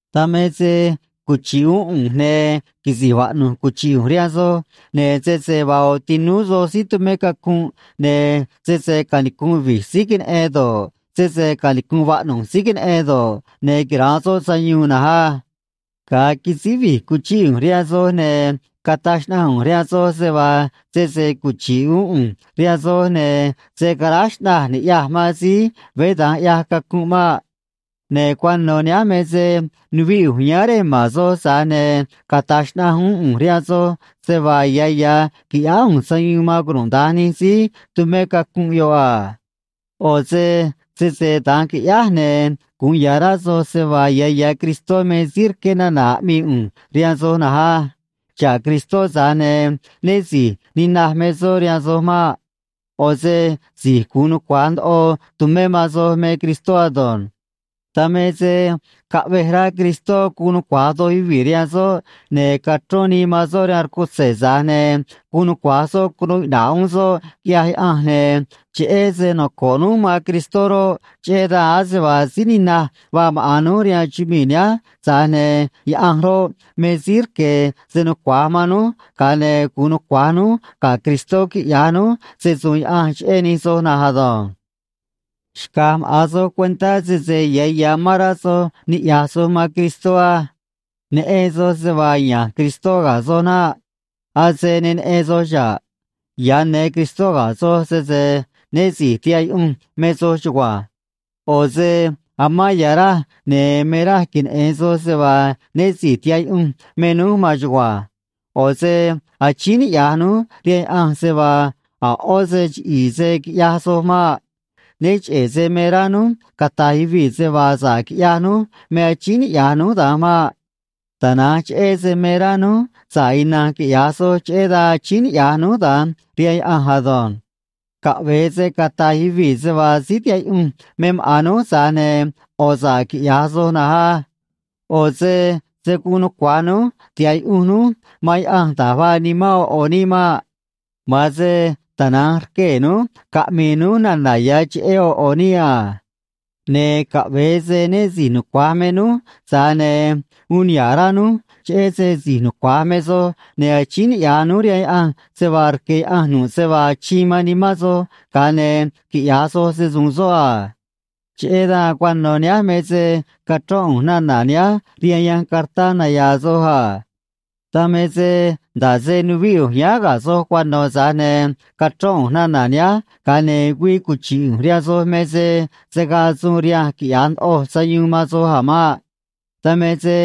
Dan me se cuchi̱ꞌ uún ꞌu̱nj, ne̱ quisi̱j vaꞌnu̱j cuchi̱ꞌ ꞌu̱nj rihaan soj, ne̱ sese vaa ꞌo̱ tinúú soj síí tumé cacunꞌ, ne̱ sese canicu̱nꞌ vi̱j síí queneꞌen do̱ꞌ, sese canicu̱nꞌ vaꞌnu̱j síí queneꞌen do̱ꞌ, ne̱ quira̱nꞌ soꞌ sayuun na̱nj á. Ga̱a quisíj vi̱j cuchíꞌ ꞌu̱nj rihaan soj, ne̱ cataj xnaꞌanj ꞌu̱nj rihaan soj se vaa sese cuchi̱ꞌ uún ꞌu̱nj rihaan soj, ne̱ se̱ caráj xꞌnaj ni̱ꞌyaj man síí veé da̱nj ꞌyaj cacunꞌ maꞌ. Ne̱ cuano̱ nihánj me se nuvíꞌ ꞌu̱nj yáán rej ma̱n soj, tza̱j ne̱ cata̱j xnaꞌanj uún ꞌu̱nj rihaan soj se vaa ya̱ ya̱ qui̱ꞌyáá ꞌu̱nj sayuun man cunuda̱nj nij síí tumé cacunꞌ yoꞌ a. ꞌO̱ se sese da̱nj qui̱ꞌyáj, ne̱ gu̱un ya̱ rá soj se vaa ya̱ ya̱ Cristó me síí rqué nana̱ aꞌmii ꞌu̱nj rihaan soj na̱nj á. Xa̱ꞌ Cristó, tza̱j ne̱ né si̱j ninaj me soꞌ rihaan soj maꞌ. ꞌO̱ se si̱j gu̱un nucua̱j ndoꞌo tu̱mé man soj me Cristó ado̱nj. Dan me se caꞌvej rá Cristó gu̱un nucua̱j doj yuvii̱ rihaan soꞌ, ne̱ cachrón nii man soꞌ rihaan rcutze̱, tza̱j ne̱ guun nucua̱j soꞌ cunuu iꞌna̱ꞌ uún soꞌ, quiꞌyaj Yaꞌanj, ne̱ cheꞌé se noco̱ꞌ núj man Cristó roꞌ, cheꞌé dan ase vaa síí ninaj vaa maꞌa̱n núj rihaan chumii̱ nihánj, tza̱j ne̱ Yaꞌanj roꞌ, me síí rque̱ se nucua̱j man núj, ga̱a ne̱ gu̱un nucua̱j núj ga̱ Cristó quiꞌya̱j núj se‑su̱u̱n Yaꞌanj cheꞌé nij soj na̱nj ado̱nj. Xca̱j maꞌa̱n soj cuentá sese ya̱ ya̱ amán rá soj niꞌya̱j soj man Cristó á. Neꞌen soj se vaa ya̱nj Cristó ga̱ soj naꞌ. Ase ne neꞌen soj xa̱ꞌ. Ya̱ ne Cristó ga̱ soj, sese né si̱j tihaꞌ yuꞌunj me soj chugua̱nj. ꞌO̱ se amán ya̱ raj, ne̱ me raj queneꞌe̱n soj se vaa né si̱j tihaꞌ yuꞌunj me núj maan chugua̱nj. ꞌO̱ se achíín niꞌya̱j núj rihaan Yaꞌanj se vaa a̱ ꞌó se chiꞌi̱i̱ se̱ quiꞌyaj soj maꞌ. Né cheꞌe̱ se me rá núj cata̱j yuvii̱ se vaa sa̱ꞌ quiꞌyaj núj me achíín niꞌya̱j núj da̱nj maꞌ. Tana̱nj cheꞌé se me rá núj sa̱ꞌ ina̱nj quiꞌya̱j soj, cheꞌé dan achíín niꞌya̱j núj da̱nj rihaan Yaꞌanj ado̱nj. Caꞌve̱e se cata̱j yuvii̱ se vaa síí tihaꞌ yuꞌunj me maꞌa̱n núj, tza̱j ne̱ ꞌo̱ sa̱ꞌ quiꞌya̱j soj na̱nj á. ꞌO̱ se se̱ guun nucua̱j núj tiha̱ꞌ yuꞌunj núj man Yaꞌanj da̱j vaa nimán ꞌo̱ ꞌo̱ níꞌ maꞌ. Ma̱an se tana̱nj rquee̱ núj caꞌmi̱i̱ núj nana̱ ya̱ cheꞌé ꞌo̱ ꞌo̱ níꞌ a. Ne̱ caꞌve̱e se né si̱j nucua̱j me núj, tza̱j ne̱ uun niha̱ꞌ rá núj cheꞌé se si̱j nucua̱j me soj, ne̱ achíín niꞌya̱j núj rihaan Yaꞌanj se vaa rque̱ Yaꞌanj nu̱ꞌ se vaa achiin man nimán soj, ga̱a ne̱ quiꞌya̱j soj se‑su̱u̱n soꞌ a. Cheꞌé dan cuano̱ nihánj me se cachrón ꞌu̱nj nana̱ nihánj rihaan yanj cartá naya̱a̱ soj a. Dan me se nda̱ꞌ se nuvíꞌ ꞌu̱nj yáán ga̱ soj cuano̱, tza̱j ne̱ cachrón ꞌu̱nj nana̱ nihánj, ga̱a ne̱ güii cuchi̱ꞌ ꞌu̱nj rihaan soj me se se̱ gaa suun rihanj quiꞌya̱j ndoꞌoj sayuun man soj a̱ maꞌ. Dan me se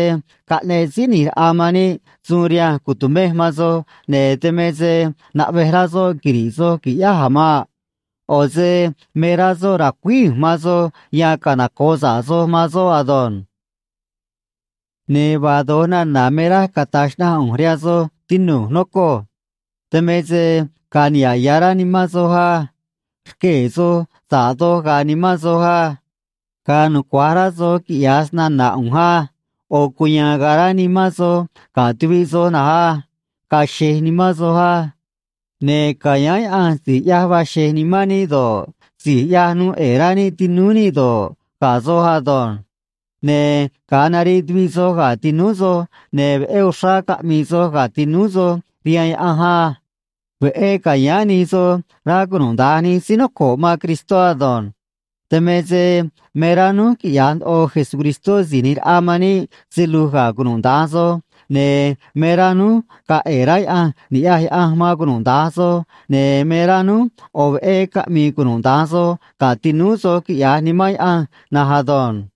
caꞌneꞌ Síí ꞌNi̱j Raꞌa man níꞌ suun rihanj cu̱tumej man soj, ne̱ dan me se naꞌvej rá soꞌ quiri̱ꞌ soj qui̱ꞌyáj a̱ maꞌ. ꞌO̱ se me rá soꞌ ra̱cuíj ꞌu̱nj man soj yan canoco̱ꞌ sa̱ꞌ soj man soꞌ ado̱nj. Ne̱ vaa do̱j nana̱ me raj cata̱j xnaꞌanj ꞌu̱nj rihaan soj, tinu̱j, nocoj. Dan me se ga̱a̱ niha̱ꞌ ya̱ rá nimán soj á. Rquee̱ soj sa̱ꞌ doj ga̱a̱ nimán soj á. Ga̱a̱ nucua̱j rá soj quiꞌya̱j snana̱ ꞌu̱nj á. ꞌO̱ cuya̱a̱n ga̱a̱ rá nimán soj ga̱ tuviꞌ soj na̱nj á. Ga̱a̱ xe̱j nimán soj á. Ne̱ ca̱yáán Yaꞌanj si̱j ꞌyaj vaa xe̱j nimán níꞌ do̱ꞌ, si̱j ꞌyaj nuu ꞌe̱e̱ rá níꞌ tinúú níꞌ do̱ꞌ, ga̱ soj ado̱nj. Ne̱ ga̱a nariꞌ tuviꞌ soj ga̱ tinúú soj, ne̱ veꞌé uxrá caꞌmi̱i̱ soj ga̱ tinúú soj rihaan Yaꞌanj á. Veꞌé ca̱yáán nij soj, rá cunuda̱nj nij síí noco̱ꞌ man Cristó ado̱nj. Dan me se me rá núj quiꞌya̱j ndoꞌo Jesucristó Si̱j ꞌNi̱j Raꞌa man níꞌ se lu̱j ga̱ cunuda̱nj soj, ne̱ me rá núj ga̱a̱ ꞌe̱e̱ rá Yaꞌanj ni̱ꞌyaj Yaꞌanj man cunuda̱nj soj, ne̱ me rá núj ꞌo̱ veꞌé caꞌmi̱i̱ cunuda̱nj soj ga̱ tinúú soj quiꞌya̱j Nimán Yaꞌanj na̱nj ado̱nj.